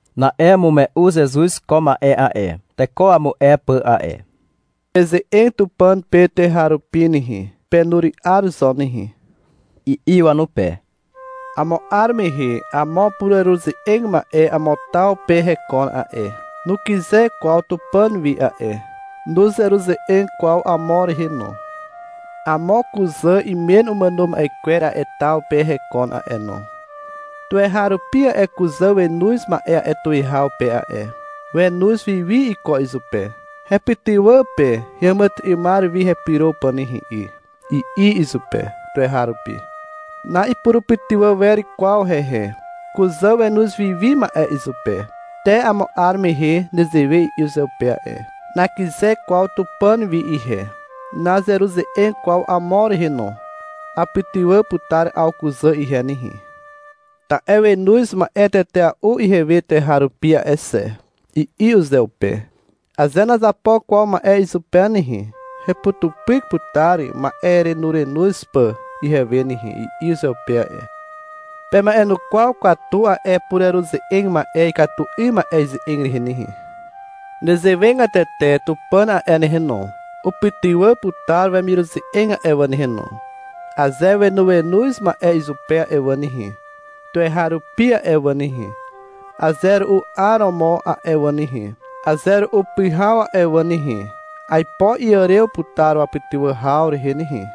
Na'e umume'u Zezuz ko ma'e a'e, teko wamu'e pà a'e. — Peze'eg Tupàn pe tuweharupi nehe, penury'ar zo nehe, i'i wanupe. Amo 'ar mehe amo pureruze'eg ma'e amo taw pe hekon a'e. Nukyze kwaw Tupàn wi a'e. Nuzeruze'eg kwaw amo rehe no. Amo kuzà imen umàno ma'e kwer a'e taw pe hekon a'e no. Tuweharupi a'e kuzà wenoz ma'e a'e tuwihaw pe a'e. Wenoz wiwi iko izupe. — Hepytywà pe heàmàtyry'ymar wi hepyro pà nehe 'y, i'i izupe tuweharupi. Na'ipurupytywà wer kwaw hehe. Kuzà wenoz wiwi ma'e izupe. Te amo 'ar mehe nezewe i'i uzeupe a'e. — Nakyze kwaw Tupàn wi ihe. Nazeruze'eg kwaw amo rehe no. Apytywà putar 'aw kuzà ihe nehe, ta'e wenoz ma'e tetea'u ihewe tuweharupi a'e xe, i'i uzeupe. — Aze nazapo kwaw ma'e izupe nehe, heputupyk putar ma'erenorenoz pà ihewe nehe, i'i uzeupe a'e. Pema'enukwaw katu a'e pureruze'eg ma'e ikatu 'ym ma'e ize'eg rehe nehe. Nezewegatete Tupàn a'e nehe no, upytywà putar wemiruze'eg a'e wà nehe no, aze wenoenoz ma'e izupe a'e wà nehe, tuweharupi a'e wà nehe, aze ru'u 'aromo a'e wà nehe, aze ru'u pyhaw a'e wà nehe. Aipo iàrew putar wapytywà haw rehe nehe.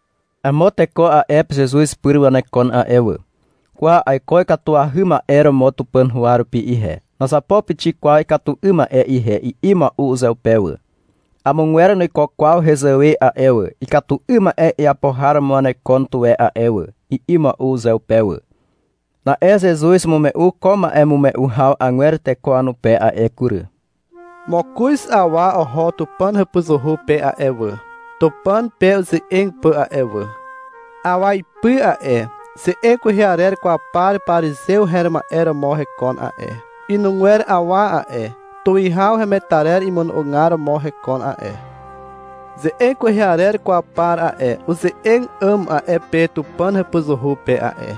Amo teko a'e pe Zezuz pyr wanekon a'e wà. — Kwa aiko ikatuahy ma'e romo Tupàn huwa rupi ihe, nazapo pixik kwaw ikatu 'ym ma'e ihe, i'i mua'u uzeupe wà. — Amogwer nuiko kwaw hezàwe a'e wà. Ikatu 'ym ma'e iapo har romo wanekon tuwe a'e wà, i'i mua'u uzeupe wà. Na'e Zezuz umume'u ko ma'emume'u haw agwer teko wanupe a'e kury. Mokoz awa oho Tupàn hàpuzuhu pe a'e wà, Tupàn pe uze'eg pà a'e wà. Awa ipy a'e, ze'eg kwehe arer kwaw par parizew her ma'e romo hekon a'e. Inugwer awa a'e, tuwihaw hemetarer imono'ogar romo hekon a'e. Ze'eg kwehe arer kwaw par a'e, uze'eg 'àm a'e pe Tupàn hàpuzuhu pe a'e.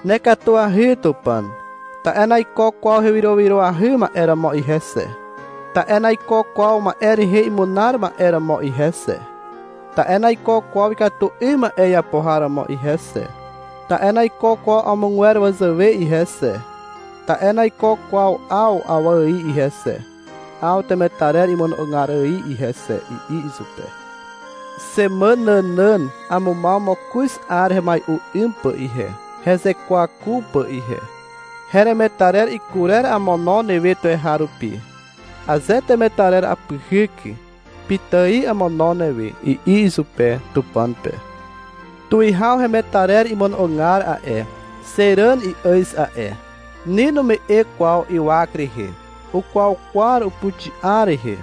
— Nekatuahy Tupàn, ta'e naiko kwaw hewyrowyroahy ma'e romo ihe xe, ta'e naiko kwaw ma'e rehe imunar ma'e romo ihe xe, ta'e naiko kwaw ikatu 'ym ma'e iapo har romo ihe xe, ta'e naiko kwaw amogwer wazàwe ihe xe. Ta'e naiko kwaw 'aw awa ài ihe xe, 'aw temetarer imono'ogar ài ihe xe, i'i izupe. — Xemàn nànàn amumaw mokoz 'ar hemai'u 'ym pà ihe, hezekwaku pà ihe. Heremetarer ikurer amono newe tuweharupi. Aze temetarer apyhyk, pitài amono newe, i'i izupe, Tupàn pe. Tuwihaw hemetarer imono'ogar a'e, xe ràn i'àz a'e. Ni nume'e kwaw ywak rehe. Ukwaukwar upuxi'a rehe,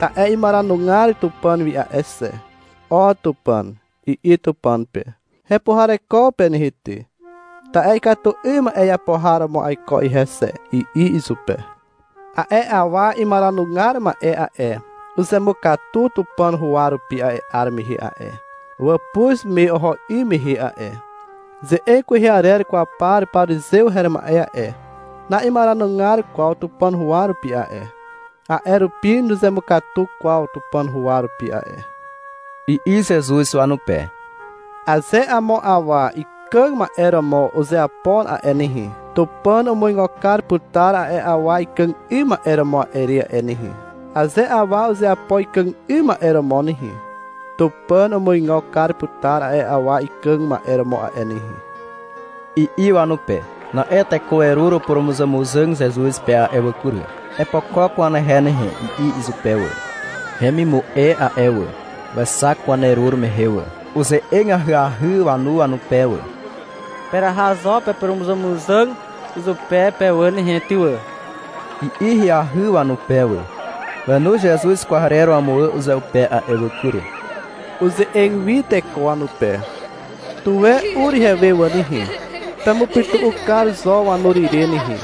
ta'e imaranugar Tupàn wi a'e xe. — O Tupàn, i'i Tupàn pe. — Hepuhareko pe nehe ty, ta'e ikatu 'ym ma'e iapo har romo aiko ihe xe, i'i izupe. A'e awa imaranugar ma'e a'e, uzemukatu Tupàn huwa rupi a'e 'ar mehe a'e, wàpuz me oho 'ym mehe a'e. Ze'eg kwehe arer kwaw par parizew her ma'e a'e, na'imaranugar kwaw Tupàn huwa rupi a'e, a'e rupi nuzemukatu kwaw Tupàn huwa rupi a'e, i'i Zezuz wanupe. — Aze amo awa ikàg ma'e romo uzeapo a'e nehe, Tupàn umuigo kar putar a'e awa ikàg 'ym ma'e romo a'e re a'e nehe. Aze awa uzeapo ikàg 'ym ma'e romo nehe, Tupàn umuigo kar putar a'e awa ikàg ma'e romo a'e nehe, i'i wanupe. Na'e teko werur upurumuzàmuzàg Zezuz pe a'e wà kury. — Epokok wanehe nehe, i'i izupe wà. Hemimu'e a'e wà, wexak wanerur mehe wà. Uze'eg ahyahy wanu wanupe wà. — Peraha zo pepurumuzàmuzàg izupe pe wà nehe ty wà, i'i ahyahy wanupe wà. Wenoz Zezuz kwarer wamuwà uzeupe a'e wà kury. Uze'eg wi teko wanupe. — Tuwe ur ihewe wà nehe. Pemupytu'u kar zo wanur ire nehe.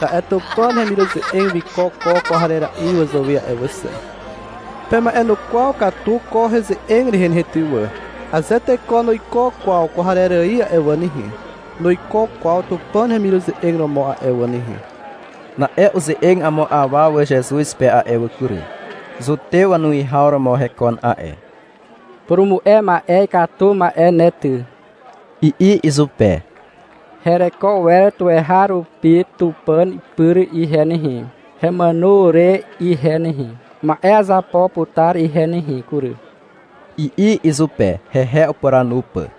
Ta'e Tupàn hemiruze'eg wiko ko kwarera'i wazàwe a'e wà xe. Pema'enukwaw katu ko heze'eg rehe nehe ty wà. Aze teko nuiko kwaw kwarer ài a'e wà nehe, nuiko kwaw Tupàn hemiruze'eg romo a'e wà nehe. Na'e uze'eg amo awa wà Zezuz pe a'e kury. Zutew wanuwihaw romo hekon a'e. — Purumu'e ma'e ikatu ma'e ne ty, i'i izupe. — Hereko wer tuweharupi Tupàn pyr ihe nehe, hemàno re ihe nehe. Ma'e azapo putar ihe nehe kury, i'i izupe, hehe upuranu pà.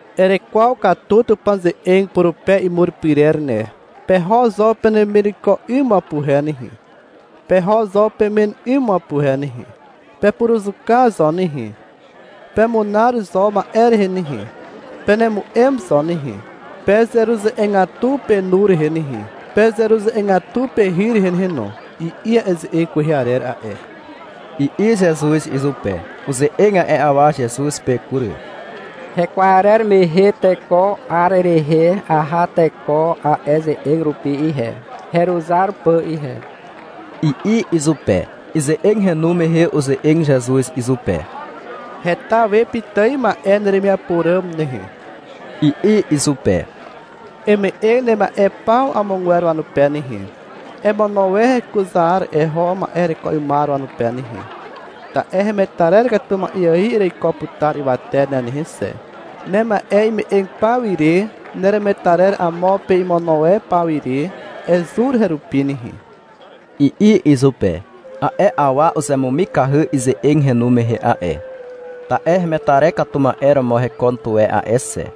Erekwaw katu Tupàn ze'eg purupe imur pyrer ne. Peho zo penemireko 'ym wapuhe nehe, peho zo pemen 'ym wapuhe nehe. Pepuruzuka zo nehe, pemunar zo ma'e rehe nehe, penemu'em zo nehe, pezeruze'egatu penu rehe nehe, pezeruze'egatu pehy rehe nehe no, i'i a'e ze'eg kwehe arer a'e, i'i Zezuz izupe. Uze'eg a'e awa Zezuz pe kury. — Hekwarer mehe te ko 'ar rehe aha teko a'e ze'eg rupi ihe, heruzar pà ihe, i'i izupe. Ize'eg henu mehe uze'eg Zezuz izupe. — Heta we pitài ma'e neremiapo ràm nehe, i'i izupe. — Eme'eg nema'e paw amogwer wanupe nehe. Emono e hekuzar eho ma'e hereko 'ymar wanupe nehe. Ta'e hemetarer katu ma'e ài ereiko putar ywate ne nehe xe. Nema'e ime'eg paw ire, neremetarer amo pe imono e paw ire, ezur herupi nehe, i'i izupe. A'e awa uzemumikahy ize'eg henu mehe a'e, ta'e hemetarer katu ma'e romo hekon tuwe a'e xe.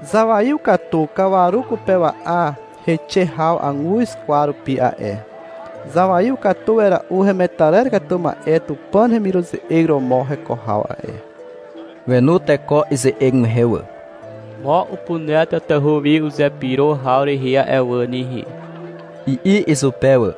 Zawaiw katu kawaru kupewa'a heixe haw aguz kwar rupi a'e. Zawaiw katu wera'u hemetarer katu ma'e Tupàn hemiruze'eg romo heko haw a'e. Wenu teko ize'eg mehe wà. — Mo upuner tatahu wi uzepyro haw rehe a'e wà nehe, i'i izupe wà.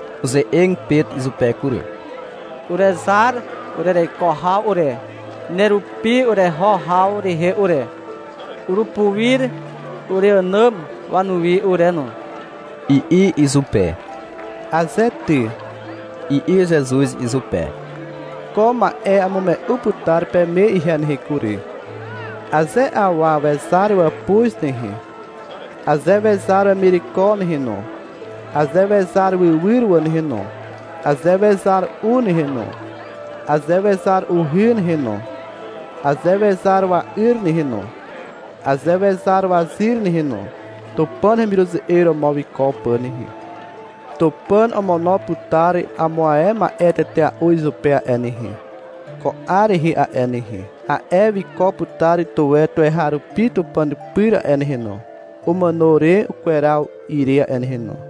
Uze'eg Pet izupe kury. — Urezar urereko haw ure, nerupi ureho haw rehe ure. Urupuir ureànàm wanuwi ure no, i'i izupe. Aze ty, i'i Zezuz izupe. Ko ma'e amume'u putar peme ihe nehe kury. Aze awa wezar wàpuz nehe, aze wezar wemireko nehe no, aze wezar wywyr wà nehe no, aze wezar u nehe no, aze wezar uhy nehe no, aze wezar wa'yr nehe no, aze wezar wazyr nehe no, Tupàn hemiruze'eg romo wiko pà nehe, Tupàn omono putar amo ae ma'e tetea'u izupe a'e nehe, ko 'ar rehe a'e nehe. A'e wiko putar tuwe tuweharupi Tupàn pyr a'e nehe no, umàno re ukweraw ire a'e nehe no.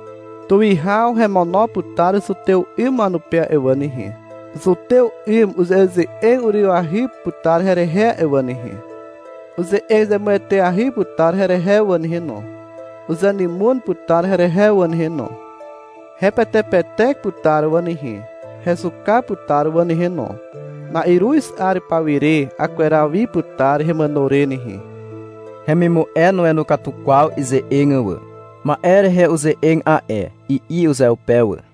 Tuwihaw hemono putar Zutew 'ym wanupe a'e wà nehe. Zutew 'ym uze'eze'eg urywahy putar herehe a'e wà nehe. Uze'eg zemueteahy putar herehe wà nehe no. Uzenymon putar herehe wà nehe no. Hepetepetek putar wà nehe. Hezuka putar wà nehe no. Na'iruz 'ar pawire akweraw wi putar hemàno re nehe. Hemimu'e nuenu katu kwaw ize'eg wà. Ma'e rehe uze'eg a'e, i'i uzeupe wà.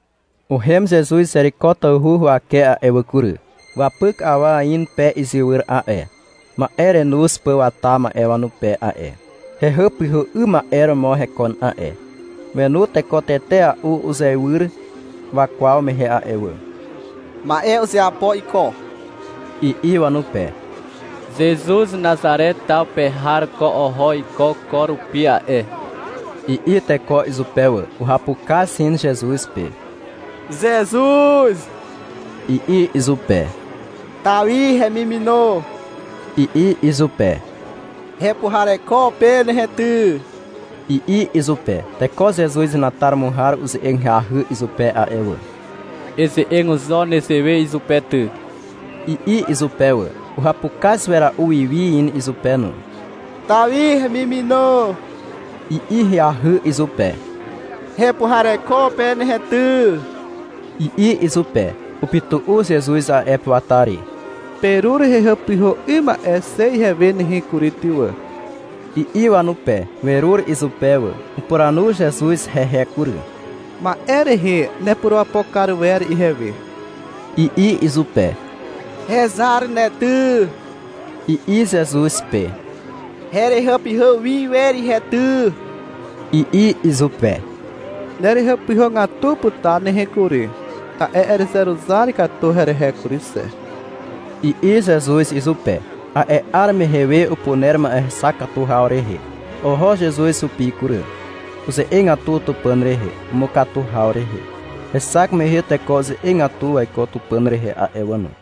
Uhem Zezuz Zeriko tawhu huwake a'e wà kury. Wapyk awa in pe izywyr a'e, ma'e renoz pà wata ma'e wanupe a'e. Hehàpyhà 'ym ma'e romo hekon a'e. Wenu teko tetea'u uzeiwyr wakwaw mehe a'e wà. — Ma'e uzeapo iko, i'i wanupe. — Zezuz Nazare taw pe har ko oho iko ko rupi a'e, i'i teko izupe wà. Uhapukaz in Zezuz pe. — Zezuz, i'i izupe. — Tawi hemimino i'i izupe. — Hepuhareko pe nehe ty, i'i izupe. Teko Zezuz henataromo har uze'eg ahyahy izupe a'e wà. — Eze'eg zo nezewe izupe ty, i'i izupe wà. Uhapukaz wera'u wiwi in izupe no. — Tawi hemimino i'i ahyahy izupe. — Hepuhareko pe nehe ty, i'i izupe. Upytu'u Zezuz a'e pe wata re. — Perur hehàpyhà 'ym ma'e xe ihewe nehe kury ty wà, i'i wanupe. Werur izupe wà. Upuranu Zezuz hehe kury. — Ma'e rehe nepurapo kar wer ihewe, i'i izupe. — Hezar ne ty, i'i Zezuz pe. — Herehàpyhà wi wer ihe ty, i'i izupe. — Nerehàpyhàgatu putar nehe kury, ta'e erezeruzar katu herehe kury xe, i'i Zezuz izupe. A'e 'ar mehe we upuner ma'e hexak katu haw rehe. Oho Zezuz hupi kury. Uze'egatu Tupàn rehe, umukatu haw rehe. Hexak mehe teko uze'egatu waiko Tupàn rehe a'e wà no.